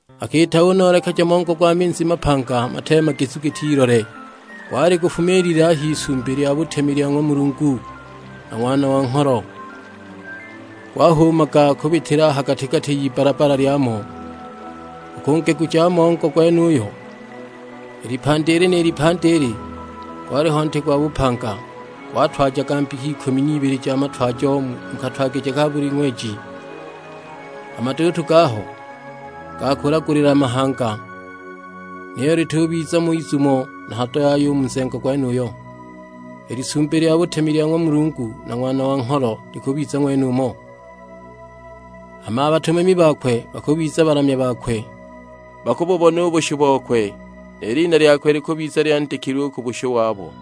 Akiita unoolekeja mongo gwa minzi mapanga mateemagizu giti ilole; gwali gufumiilile a h'Isumbi lya butemi lya ng'wa Mulungu na Ng'wana wa Ngholo. Gwahuumaga kubitila a ha gati-gati y'ibbala-bbala lyamo. U ku ngegu ja mongo gwenuyo, i lipandi ili ni lipandi ili, gwaliho nti gwa bupanga, gwatwajaga mbika ikumi n'ibili ja matwajo; mu katwagije ka buli ng'weji. A maduutu gaho ga kulagulila mahanga. Niyo litubiza mo izumo na hado yaya u mu nzengo gwenuyo; i Lisumbi lya butemi lya ng'wa Mulungu na Ng'wana wa Ngholo likubiza ng'wenumo, hama a batumami bakwe bakubiza balamya bakwe. Bakububona u bushu bokwe, ni lina lyakwe likubiza lyandikilwe u ku bushu wabo.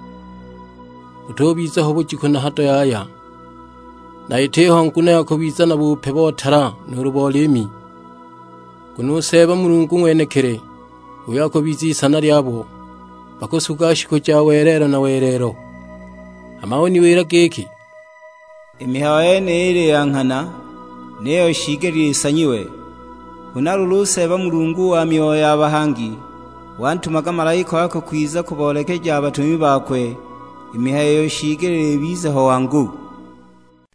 Butubiza ho bujiku na hado yaya, na itiho nguno ya kubiza na bupe bo tala nuulu bo liimi, nguno u Seeba Mulungu ng'wenekili h'uyo akubiza Isana lyabo, bakusuga shiku ja welelo na welelo. Hama uniwila giki, "I mihayo yeniyi ili ya nghana, niyo shiigelile isanyiwe. Huna luulu, u Seeba Mulungu wa myoyo ya bahangi, wantumaga malaika wakwe kwiza kuboolekeja a batumami bakwe, i mihayo iyo shiigelile ibize ho wangu."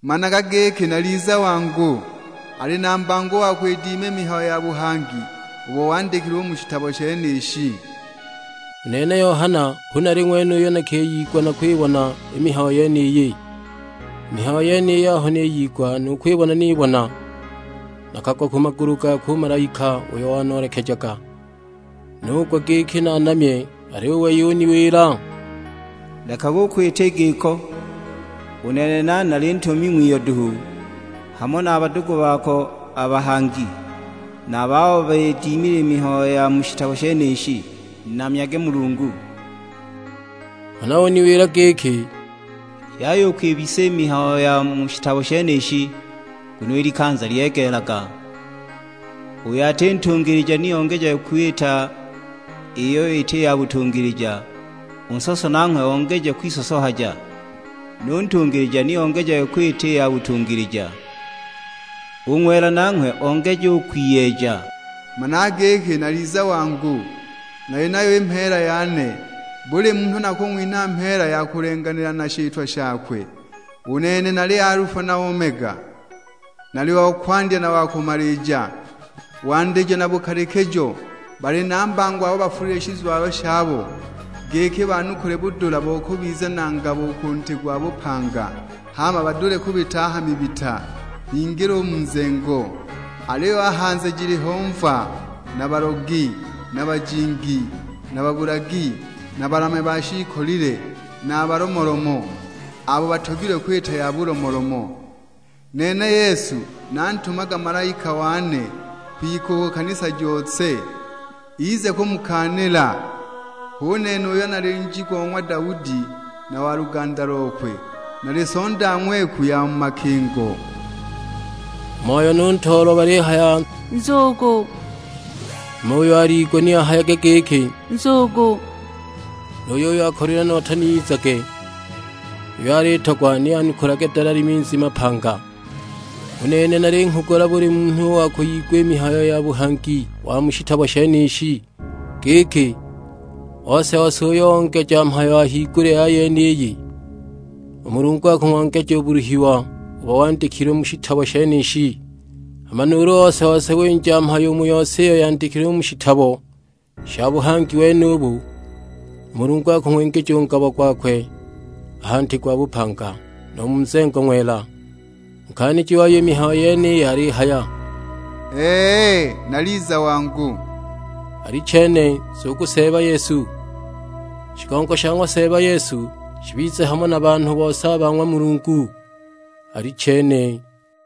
"Managa giki naliza wangu, ali na mbango u wa kwidima i mihayo ya buhangi ubo wandikilwe u mu shitabo shenishi!" U nene Yohana hu nali ng'wene uyo nakiyigwa na kwibona i mihayo yeniyi. I mihayo yeniyi aho niyigwa nu kwibona nibona, nakagwa ku magulu gakwe u malaika uyo wanoolekejaga, nugwa giki naanamye! Aliyo u wei uniwila, "Lekaga u kwita i giko, u nene nane nali ntumami ng'wiyo duhu, hamo na a badugu bako a bahangi, na a babo bidimile i mihayo ya mu shitabo shenishi, namyage Mulungu!" Huna uniwila giki, "Yaya u kwibisa i mihayo ya mu shitabo shenishi, nguno i likanza lyegeelaga. Uyo ati ntungilija ni ongejage kwita iyo iti ya butungilija, u nsoso nanghwe ongeje kwisosohaja; nu ntungilija ni ongejage kwita i ya butungilija, u ng'wela nanghwe ongeje u kwiyeeja. Managa giki naliza wangu, nali nayo ni mheela yane. Buli munhu nakung'winha mheela ya kulenganila na shitwa shakwe. U nene nali Alufa na Omega, nali wa Kwandya na wa Kumalija, Wandijo na Bukalikijo. Bali na mbango abo bafulile shizwalo shabo, giki banukule budula bo kubiza na ngabo u ku nti gwa bupanga, hama badule kubita a ha mibita, bingile u mu nzengo. Aliyo a hanze jiliho mva, na balogi, na bajingi, na babulagi, na balamya ba shiikolile; na a balomolomo, abo batogilwe kwita ya bulomolomo. Nene Yesu nantumaga malaika wane kwika ku kanisa jose, ize kumukaanila. Hu nene uyo nali Nji go ng'wa Daudi na wa luganda lokwe; nali Sonda ng'weku ya mu makingo." U Moyo nu Ntoolwa balihaya, "Nzugu!" Hama uyo aliigwa ni ahayage giki, "Nzugu!" nu yuyo akolilwe nota ni izage. Uyo alitogwa ni anukulage dalali minzi mapanga. U nene nalinghugula buli munhu u wa kwiyigwa i mihayo ya buhangi wa mu shitabo shenishi giki, ose-ose uyo ongeja mhayo a higulya ya yeniyi, u Mulungu akung'ongeja u buluhiwa ubo wandikilwe u mu shitabo shenishi. Hama nuulu ose-ose winja mhayo u mu yose iyo yandikilwe u mu shitabo sha buhangi wenubu, u Mulungu akung'wingija u ngabo gwakwe a ha nti gwa bupanga, nu mu nzengo ng'wela. U Nkaaniji wayo i mihayo yeniyi alihaya, "Ee, naliza wangu." Alichene, nzugu Seeba Yesu. Shigongo sha ng'wa Seeba Yesu shibize hamo na banhu bose a ba ng'wa Mulungu: Alichene.